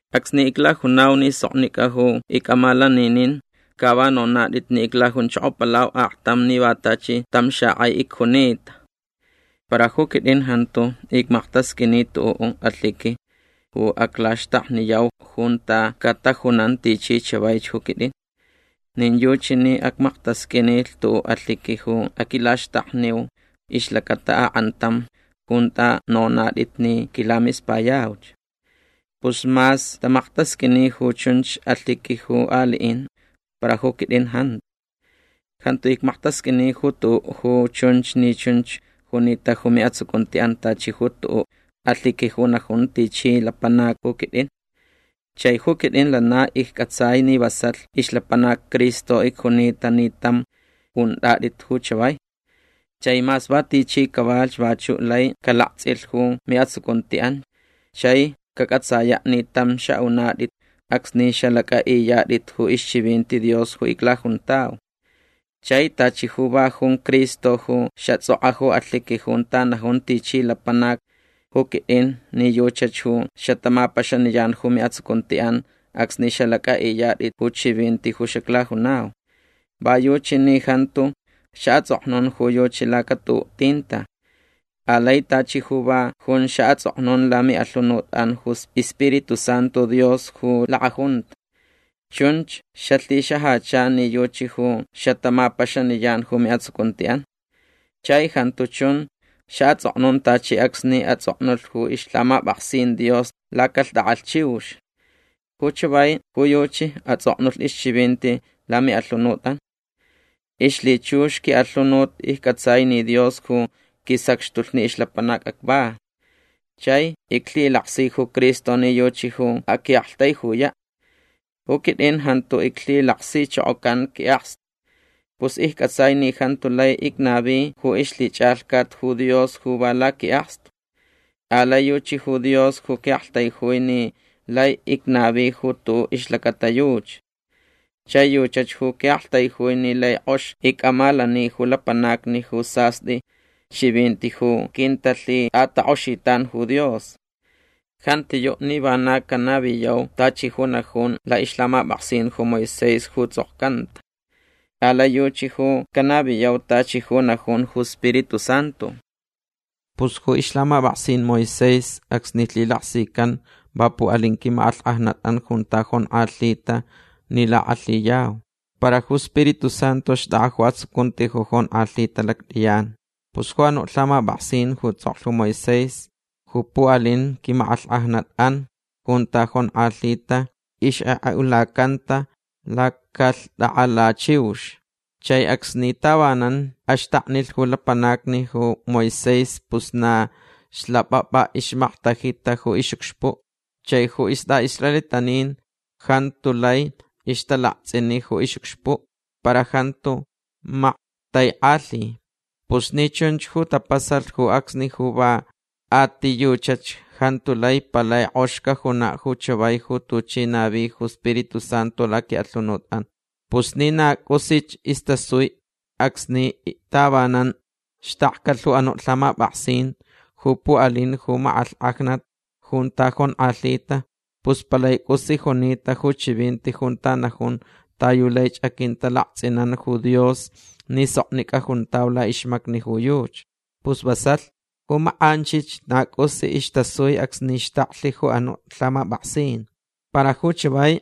Acsni iclajunau ni soknicʼa ju icʼamalaninin ca va nonatʼit ni iclajunchokopalau aktam ni va tachi tam xakʼai icjunita. Para ju quitʼin jantu icmaktasqʼuini tuʼuʼ alhiqui ju aclaxtakniyau junta catajunan tichi chavaich ju quitʼin. Nin yuchi ni acmaktasqʼuinilh tuʼuʼ alhiqui ju aquilaxtakniu ixlacata akʼantam junta nonatʼit ni quilamispayauch. Pus mas tamaktasqʼuini ju chunch alhiqui ju aliʼin para ju quitʼin jantu. Jantu icmaktasqʼuini ju tuʼuʼ ju chunch ni chunch junita ju miʼatsucuntiʼan tachi ju tuʼuʼ alhiqui ju najun tichi lapanac ju quitʼin. Chai ju quitʼin lana iccʼatsai ni vasalh ixlapanac Cristo icjunita ni tam untʼatʼit ju chavai. Chai mas va tichi cavalhch vachuʼ lai calaktsʼilh ju miʼatsucuntiʼan chai cacʼatsayaʼ ni tam xaʼunatʼit acsni xalacʼaʼiyatʼit ju ixchivinti Dios ju iclajuntau. Chai tachi ju va jun Cristo ju xatsʼokʼa ju alhiqui junta najun tichi lapanac ju quitʼin ni yuchach ju xatamapaxaniyan ju miʼatsucuntiʼan acsni xalacʼaʼiyatʼit ju chivinti ju xaclajunau. Va yuchi ni jantu xaʼatsʼoknun ju yuchi laca tuʼuʼ tinta. Alai tachi ju va jun xaʼatsʼoknun lamiʼalhunutʼan ju iSpiritu Santu Dios ju lakʼajunta. Chunch xalhixajacha ni yuchi ju xatamapaxaniyan ju miʼatsucuntiʼan. Chai jantu chun xaʼatsʼoknun tachi acsni atsʼoknulh ju ixlhamapʼaksin Dios lacalhtʼakʼalh chiux. Ju chavai ju yuchi atsʼoknulh ixchivinti lamiʼalhunutʼan. Ixlhichux quiʼalhunut iccʼatsai ni Dios ju quisacxtulh ni ixlapanac acva. Chai iclhilaksi ju Cristo ni yuchi ju aquiʼaktaijuyaʼ. Ju quitʼin jantu iclhilaksichokocan quiʼakstu. Pus iccʼatsai ni jantu lai icnavi ju ixlhichʼalhcat ju Dios ju va laquiʼakstu. Alai yuchi ju Dios ju quiʼaktaijui ni lai icnavi ju tuʼuʼ ixlacata yuchi. Chai yuchach ju quiʼaktaijui ni lai kʼox icʼamalani ju lapanacni ju sastʼi chivinti ju quintalhitʼatakʼoxitan ju Dios. Jantiyuʼ ni vana canaviyau tachi ju najun laʼixlhamapʼaksin ju Moisés ju tsʼokcanta. Alai yuchi ju canaviyau tachi ju najun ju Spiritu Santu. Pus ju ixlhamapʼaksin Moisés acsni lhilaksican va puʼalin quimakʼalhkʼajnatʼan junta jonkʼalhita ni lakʼalhiyau. Para ju Spiritu Santu xtʼakʼa ju atsucunti ju jonkʼalhita lactʼiyan. Pus ju anuʼ lhamapʼaksin ju tsʼoklh ju Moisés ju puʼalin quimakʼalhkʼajnatʼan junta jonkʼalhita ixkʼekʼeʼulacanta lacalhtʼakʼalh chiux. Chai acsni tavanan axtaknilh ju lapanacni ju Moisés pus na xlapʼapʼa ixmaktajita ju ixʼucxpuʼ. Chai ju istʼaʼisraelitanin jantu lai ixtalaktsʼini ju ixʼucxpuʼ. Para jantu maktaikʼalhi. Pus ni chunch ju tapasalh ju acsni ja va a ti yuchach jantu lai palai kʼox cajunaʼ ju chavai ju tuchi navi ju Spiritu Santu laquiʼalhunutʼan. Pus ni na cʼusich istasui acsni tavanan xtakcalh ju anuʼ lhamapʼaksin ju puʼalin ju makʼalhkʼajnat junta jonkʼalhita pus palai cʼus junita ju chivinti junta najun ta yu laich aquintalaktsʼinan ju Dios ni soknicʼa juntau laʼixmacni ju yuchi. Pus vasalh. Ju makʼanchich na cʼusich istasui acsni xtaklh ju anuʼ lhamapʼaksin. Para ju chavai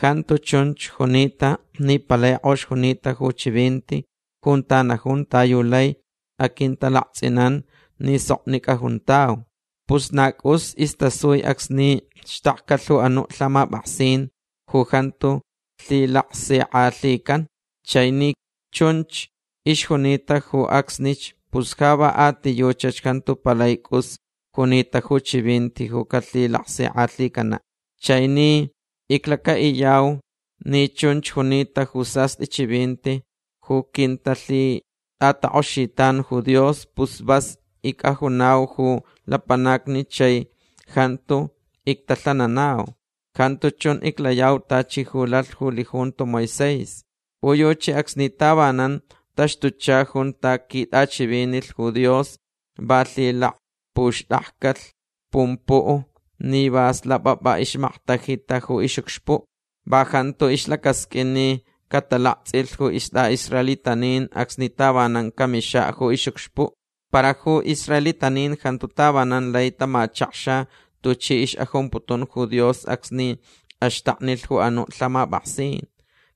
jantu chunch junita ni palai kʼox junita ju chivinti junta najun ta yu lai aquintalaktsʼinan ni soknicʼa juntau. Pus na cʼus istasui acsni xtakcalh ju anuʼ lhamapʼaksin ju jantu lhilaksikʼalhican. Chai ni chunch ixjunita ju acsnich pus ja va a ti yuchach jantu palai cʼus junita ju chivinti ju calhilaksikʼalhicanaʼ. Chai ni iclacaʼiyau ni chunch junita ju sastʼi chivinti ju quintalhitʼatakʼoxitan ju Dios pus vas icʼajunau ju lapanacni chai jantu ictalhananau. Jantu chun iclayau tachi ju lalh ju lijunto Moisés. Ju yuchi acsni tavanan taxtucha junta quitʼachivinilh ju Dios va lhilakpuxtakcalh pumpuʼ ni va slapʼapʼa ixmaktajita ju ixʼucxpuʼ. Va jantu ixlacasqʼuin ni catalaktsʼilh ju istʼaʼisraelitanin acsni tavanan camixaʼ ju ixʼucxpuʼ. Para ju israelitanin jantu tavanan lai tamachakxa tuchi ixʼajumputun ju Dios acsni axtaknilh ju anuʼ lhamapʼaksin.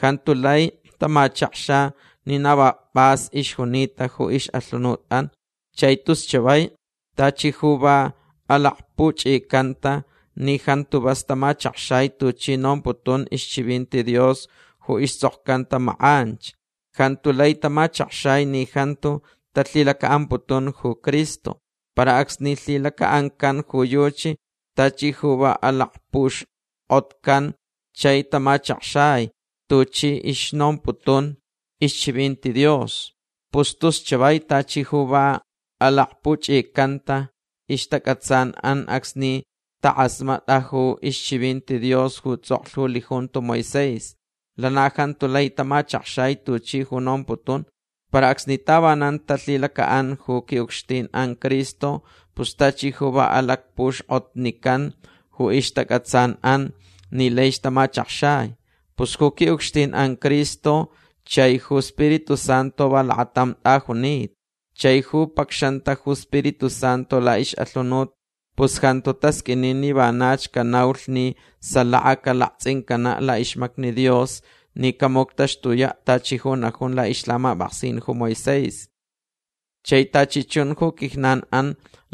Jantu lai tamachakxa ni na va pʼas ixjunita ju ixʼalhunutʼan. Chai tus chavai tachi ju va alakpuchʼicanta ni jantu vas tamachakxai tuchi nomputun ixchivinti Dios ju istsʼokcanta makʼanch. Jantu lai tamachakxai ni jantu talhilacaʼamputun ju Cristo. Para acsni lhilacaʼancan ju yuchi tachi ju va alakpuxkʼotcan chai tamachakxai tuchi ixnomputun ixchivinti Dios. Pus tus chavai tachi ju va alakpuchʼicanta ixtacʼatsanʼan acsni takʼasmatʼa ju ixchivinti Dios ju tsʼoklh ju lijunto Moisés. Lana jantu lai tamachakxai tuchi ju nomputun. Para acsni tavanan talhilacaʼan ju quiʼucxtinʼan Cristo pus tachi ju va alakpuxkʼotnican ju ixtacʼatsanʼan ni laich tamachakxai. Pus ju quiʼucxtinʼan Cristo chai ju Spiritu Santu va lakatam tʼajunita. Chai ju pacxanta ju Spiritu Santu laʼixʼalhunut pus jantu tasqʼuini ni vanach canaulh ni salaka calaktsʼincanaʼ laʼixmacni Dios ni camuctaxtuyaʼ tachi ju najun laʼixlhamapʼaksin ju Moisés. Chai tachi chun ju quijnanʼan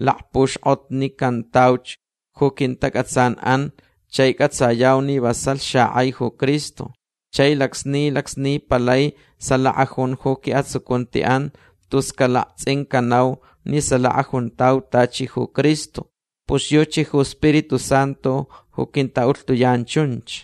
lakpuxkʼotnicantauch ju quintacʼatsanʼan chai cʼatsayau ni vasalh xakʼai ju Cristo. Chai lacsni lacsni palai salaka jun ju quiʼatsucuntiʼan tus calaktsʼincanau ni salaka juntau tachi ju Cristo. Pus yuchi ju Spiritu Santu ju quintaʼulhtuyan chunch.